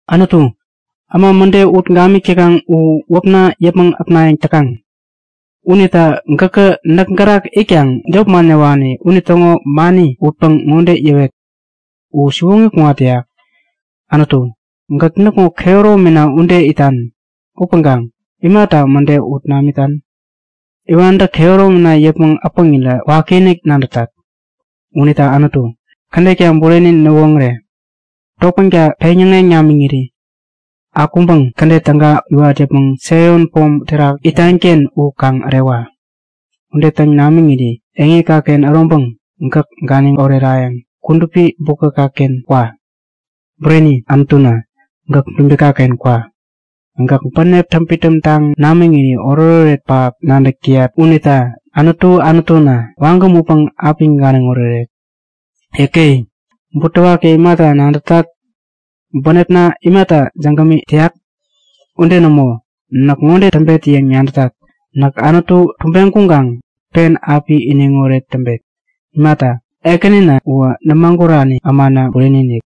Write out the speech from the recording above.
Anutu, äma mäde ut gamik täkaŋ u wäpna yäpmäŋ äpnayäŋ täkaŋ. Unita gäkä näk gärak itkaŋ jop man yäwani unitäŋo mani utpäŋ ŋode yäwet; U siwoŋi kuŋat täyak. Anutu, gäk näkŋo kehäromina ude itan upäŋkaŋ imata mäde ut namitan? Iwantä kehäromina yäpmäŋ äpäŋirä wakiinik nadätat. Unita Anutu, kädetka bureni näwoŋäre! Topänka peŋyäŋeŋ namiŋiri akuŋpäŋ kädet täga iwat yäpmäŋ Saion Pom terak, itanken u kaŋ ärewa. Ude täŋ namiŋiri eŋikaken äroŋpäŋ gäk ganiŋ orerayäŋ kudupi bukäkaken kwa. Bureni, Anutuna, gäk dubikaken kwa. Gäk bänepna täŋpidäm taŋ namiŋiri oretoret pähap nadäk täyat unita Anutu Anutuna, wagäm utpäŋ api ganiŋ oreret. Yäke! Butewaki imata nadätat? Bänepna imata jägäm täyak? Ude nämo! Näk ŋode täŋpet yäŋ nadätat; Näk Anutu tubeŋ kuŋkaŋ pen api iniŋoret täŋpet! Imata, Ekänina uwä nämagurani ämana bureni-inik!